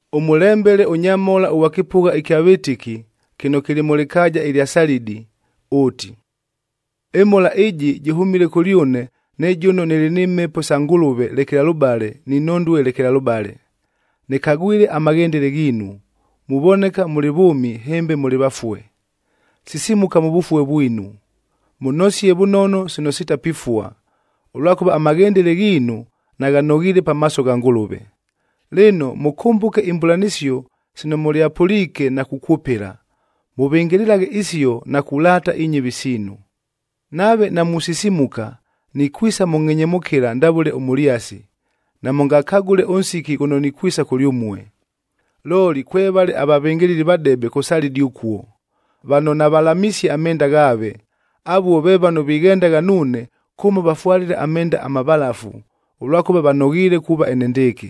“Ʉmʉlembele ʉnyamhola ʉghwa kɨpʉgha ɨkya vɨtɨki kɨno kɨlɨ mʉ lɨkaaja ɨlya Salidi ʉʉti, ‘Ɨmhola ɨjɨ jɨhʉmile kʉlyʉne ne jʉno nɨlɨ ni Mhepo sa Ngʉlʉve lekelalʉbale ni nhondue lekelalʉbale. Nɨkagwile amaghendele ghiinu, muvoneka mʉlɨ vʉʉmi hɨmbe mʉlɨ vafue. Sisimuka mʉ vʉfue vwinu, mʉnosie vʉnono sino sitapifua, ʉlwakʉva amaghendele ghiinu naghanoghiile pamaaso gha Ngʉlʉve. Lɨno, mʉkʉmbʉke imbʉlanɨsio sino mʉlyapʉliike na kukwʉpɨla, mʉvɨngɨlɨlaghe isio na kulaata inyɨvi siinu. Nave namusisimuka, nikwisa mʉ ngʼhenyemʉkɨla ndavʉle ʉmʉlyasi, namʉngakagʉle ʉnsiki ghʉno nikwisa kʉlyʉmue. Looli, kwevale avavɨngɨlɨli vadebe kʉ Salidi ʉkuo, vano navalamisie amenda ghaave. Avuo ve vano vighendagha nuune kʉmo vafwalile amenda amavalafu, ʉlwakʉva vanoghiile kuuva enendɨɨkɨ.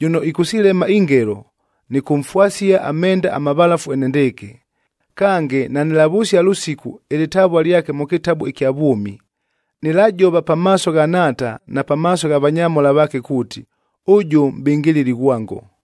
Jʉno ɨkʉsilema ingelo, nɨkʉmfwasia amenda amavalafu enendɨɨkɨ, kange nanɨlavʉsia lʉsiku ɨlɨtavua lyake mʉ kɨtabu ɨkya vwʉmi.a Nɨlajova pamaaso gha Nhaata na pamaaso gha vanyamhola vaake kuuti, ʉjʉ mʼbɨngɨlɨli ghwango.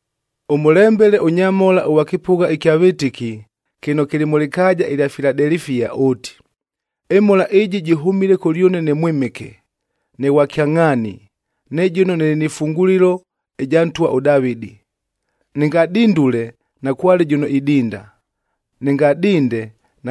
“Ʉmʉlembele ʉnyamhola ʉghwa kɨpʉgha ɨkya vɨtɨki kɨno kɨlɨ mʉ lɨkaaja ɨlya Filadelifia ʉʉti, ‘Ɨmhola ɨjɨ jɨhʉmile kʉlyʉne ne Mwɨmɨke, ne Ghwa Kyangʼhaani, ne jʉno nɨlɨ nɨ fungulilo ɨja ntwa ʉDavɨdi.b Nɨngadindule, nakwale jʉno idinda. Nɨngadinde,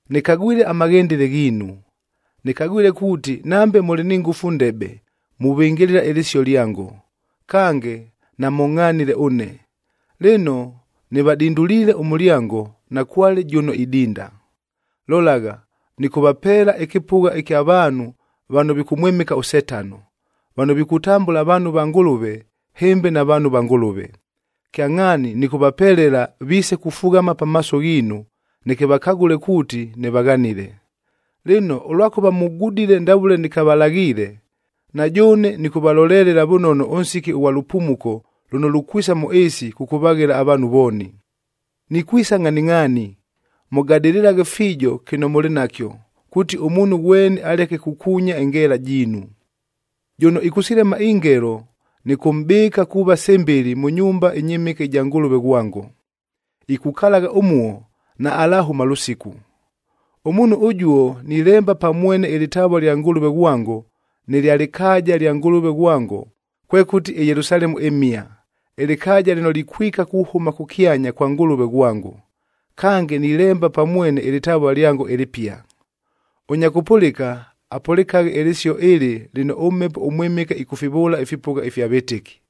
Nɨkagwile amaghendele ghiinu. Nɨkagwile kuuti nambe mʉlɨ ni ngʉfu ndebe, muvɨngɨlɨla ɨlɨsio lyango, kange namʉngʼhanile ʉne. Lɨno, nɨvadinduliile ʉmʉlyango, nakwale jʉno idinda. Lolagha, nɨkʉvapeela ɨkɨpʉgha kya vaanhu vano vikʉmwɨmɨka ʉSetano, vano vikutambʉla vaanhu va Ngʉlʉve, hɨmbe navaanhu va Ngʉlʉve. Kyangʼhaani nɨkʉvapelela viise kufughama pamaaso ghiinu, neke vakagʉle kuuti nɨvaghanile. Lɨno, ʉlwakʉva mugudile ndavʉle nɨkavalaghiile, na jʉʉne nɨkʉvalolelela vʉnono ʉnsiki ʉghwa lʉpumuko lʉno lukwisa mʉ ɨɨsi kʉkʉvaghela avaanhu vooni. Nikwisa ngʼhaningʼhaani! Mʉgadɨlɨlaghe fiijo kɨno mʉlɨ nakyo, kuuti ʉmuunhu ghweni aleke kukuunya ɨngeela jiinu. Jʉno ɨkʉsilema ingelo, nɨkʉmʼbɨɨka kuuva sɨmbɨlɨ mʉ nyumba ɨnyɨmɨke ɨja Ngʉlʉved ghwango, ikukalagha ʉmuo, naalahʉma lʉsiku. Ʉmuunhu ʉjuo nilemba pa mwene ɨlɨtavua lya Ngʉlʉve ghwango nɨ lya lɨkaaja lya Ngʉlʉve ghwango, kwekʉti ɨYelusalemu ɨmhia, ɨlɨkaaja lɨno likwika kuhʉma kʉkyanya kwa Ngʉlʉve ghwango. Kange, nilemba pa mwene ɨlɨtavua lyango ɨlɨpia. Ʉnya kʉpʉlɨka, apʉlɨkaghe ɨlɨsio ɨlɨ lɨno ʉMhepo ʉMwɨmɨke ɨkʉfivʉʉla ifipʉgha ifya vɨtɨki.’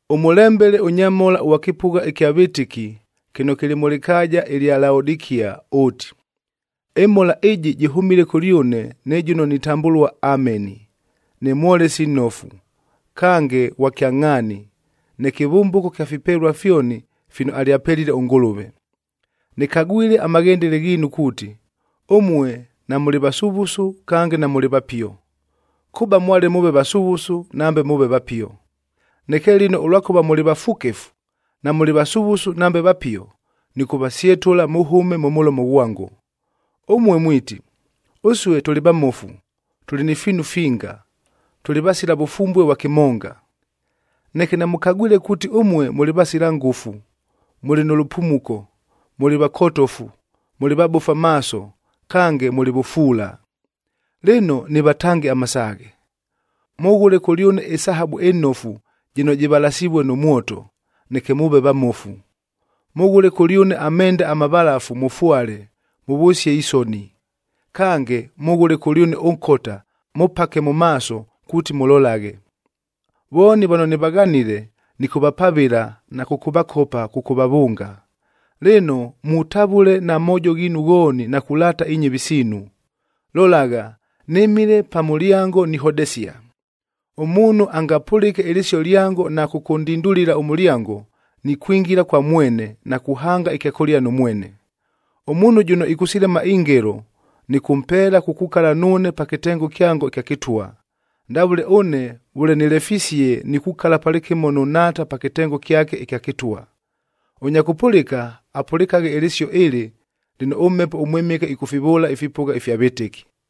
“Ʉmʉlembele ʉnyamhola ʉghwa kɨpʉgha ɨkya vɨtɨki kɨno kɨlɨ mʉ lɨkaaja ɨlya Laodikia ʉʉti, ‘Ɨmhola ɨjɨ jɨhʉmile kʉlyʉne ne jʉno nitambʉlua Ameni, ne mwolesi nnofu, kange ghwa kyangʼhaani, ne kɨvʉmbʉko kya fipelua fyoni fino alyapelile ʉNgʉlʉve. Nɨkagwile amaghendele ghiinu kuuti, ʉmue namʉlɨ vasuvusu kange namʉlɨ vapio. Kʉba mwale mʉʉve vasuvusu nambe mʉʉve vapio. Neke lɨno ʉlwakʉva mʉlɨ vafukefu, namʉlɨ vasuvusu nambe vapio, nɨkʉvasyetʉla mʉhʉme mʉ mʉlomo ghwango. Ʉmue mwiti, “Ʉsue tʉlɨ vamofu, tʉlɨ ni fiinu finga, tʉlɨ vasila vʉfumbue vwa kɨmonga!” Neke namʉkagwile kuuti ʉmue mʉlɨ vasila ngʉfu, mʉlɨ nʉ lʉpumuko, mʉlɨ vakotofu, mʉlɨ vabofu amaaso kange mʉlɨ vʉfuula. Lɨno, nɨvatange amasaaghe: Mʉghʉle kʉlyʉne ɨsahabu ɨnofu jɨno jɨvalasivue nʉ mwoto, neke mʉʉve vamofu. Mʉghʉle kʉlyʉne amenda amavalafu mʉfwale, mʉvʉsie isoni. Kange, mʉghʉle kʉlyʉne ʉnkota mʉpake mʉ maaso kuuti mʉlolaghe. Vooni vano nɨvaghanile, nɨkʉvapavɨla na kʉkʉvakopa kʉkʉvavʉnga. Lɨno, mutavʉle na moojo ghiinu ghooni na kulaata inyɨvi siinu. Lolagha, nɨmile pa mʉlyango nihodesia. Ʉmuunhu angapʉlɨke ɨlɨsio lyango na kʉkʉndindulila ʉmʉlyango, nikwingila kwa mwene na kuhanga ɨkyakʉlia nʉ mwene. Ʉmuunhu jʉno ɨkʉsilema ingelo nɨkʉmpeela kukukala nuune pa kɨtengo kyango ɨkya kɨtwa, ndavʉle ʉne vʉle nɨlefisie nikukala palɨkɨmo nʉ Nhaata pa kɨtengo kyake ɨkya kɨtwa. Ʉnya kʉpʉlɨka, apʉlɨkaghe ɨlɨsio ɨlɨ lɨno ʉMhepo ʉMwɨmɨke ɨkʉfivʉʉla ifipʉgha ifya vɨtɨki.’”